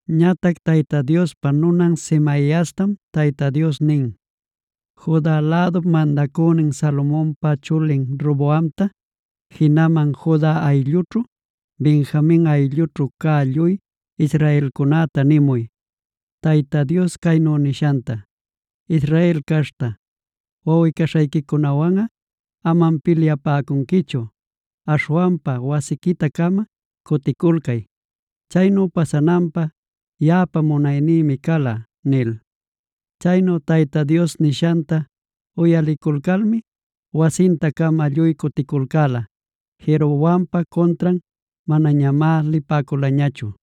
Ñatac Tayta Diospa nunan Semaiastam Tayta Dios nin: “Juda lädup mandacünin Salomonpa chulin Roboamta, jinaman Juda ayllućhu, Benjamin ayllućhu cä lluy israelcunäta nimuy, Tayta Dios caynu nishanta: ‘Israel caśhta, wawꞌi-caśhayquiwanꞌa amam pilyapäcunquichu. Aśhwanpa wasiquita-cama cuticulcay. Chaynu pasananpä yaꞌapa munaynïmi cala’” nil. Chaynu Tayta Dios nishanta uyaliculcalmi wasinta-cama lluy cuticulcäla. Jeroboampa cuntran manañamá lipäculañachu.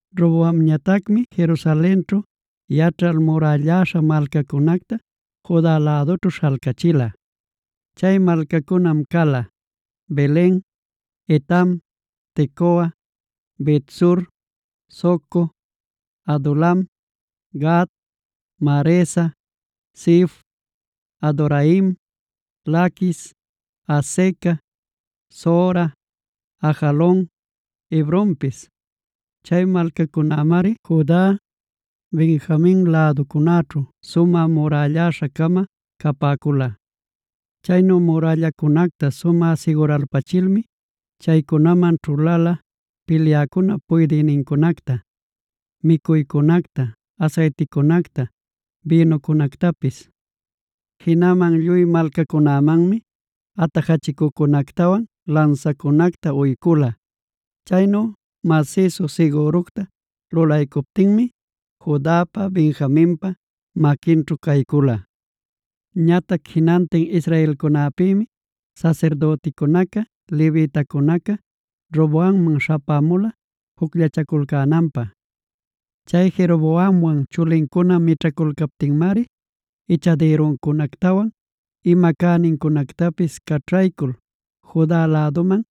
Roboamñatacmi Jerusalenćhu yaćhal murälläśha malcacunacta Juda lädućhu śhalcachila. Chay malcacunam cala: Belen, Etam, Tecoa, Bet-sur, Soco, Adulam, Gat, Maresa, Zif, Adoraim, Laquis, Azeca, Zora, Ajalon, Hebronpis. Chay malcacunämari Juda, Benjamin läducunaćhu sumä murälläśha-cama capäcula. Chaynu murällacunacta sumä siguralpachilmi, chaycunaman ćhulala pilyäcunap puydïnincunacta, micuycunacta, asayticunacta, bïnucunactapis. Jinaman lluy malcacunämanmi atajachicucunactawan lansacunacta uycula. Chaynu masïsu sigüructa lulaycuptinmi, Judapa Benjaminpa maquinćhu caycula. Ñatac jinantin israelcunäpïmi sasirdüticunaca, levitacunaca Roboamman śhapämula jucllachaculcänanpä. Chay Jeroboamwan chulincuna mićhaculcaptinmari, ichadïruncunactawan ima cänincunactapis caćhaycul Juda läduman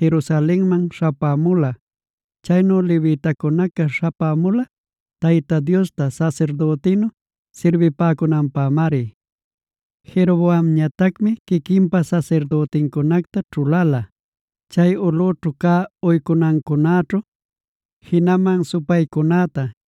Jerusalenman śhapämula. Chaynu levitacunaca śhapämula, Tayta Diosta sasirdütinnu sirbipäcunanpämari. Jeroboamñatacmi quiquinpa sasirdütincunacta ćhuläla, chay ulꞌućhu cä uycunacunäćhu, jinaman supaycunäta,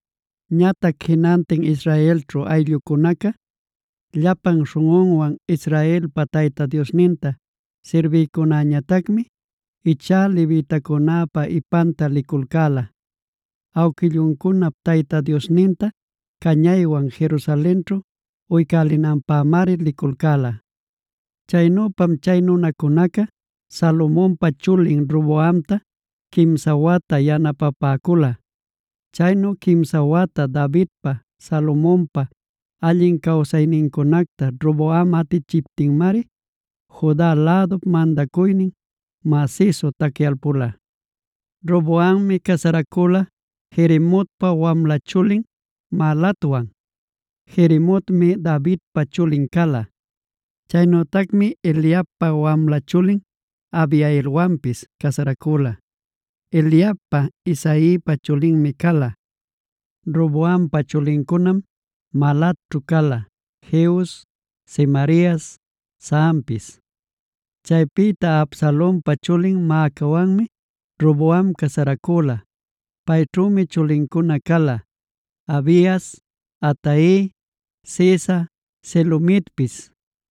Ñatac jinantin Israelćhu ayllucunaca llapan śhunꞌunwan Israelpa Tayta Diosninta sirbïcunäñatacmi ichá levitacunäpa ipanta liculcäla. Awquilluncunap Tayta Diosninta cañaywan Jerusalenćhu uycälinanpämari liculcäla. Chaynüpam chay nunacunaca Salomonpa chulin Roboamta quimsa wata yanapapäcula. Chaynu quimsa wata Davidpa, Salomonpa allin cawsaynincunacta Roboam atichiptinmari Juda lädup mandacuynin masïsu tacyalpula. Roboammi casaracüla Jerimotpa wamla chulin Mahalatwan; Jerimotmi Davidpa chulin cala. Chaynütacmi Eliabpa wamla chulin Abihailwanpis casaracüla. Eliabꞌa Isaipa chulinmi cala. Roboampa chulincunam Mahalatćhu cala: Jeus, Semarias, Zahampis. Chaypïta Absalonpa chulin Maacawanmi Roboam casaracüla. Payćhümi chulincuna cala: Abias, Atai, Ziza, Selomitpis.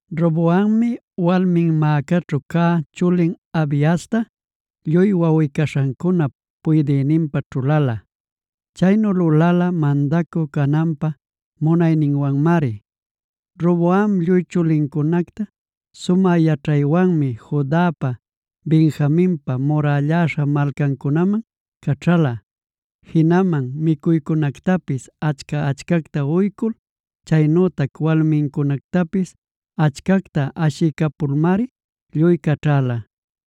Roboammi walmin Maacaćhu cä chulin Abiasta lluy wawꞌi-caśhancunap puydïninpä ćhuläla. Chaynu lulala mandacü cananpä munayninwanmari. Roboam lluy chulincunacta sumä yaćhaywanmi Judapa, Benjaminpa murälläśha malcancunaman caćhäla. Jinaman micuycunactapis achca-achcacta uycul chaynütac walmincunactapis achcacta ashiycapulmari lluy caćhäla.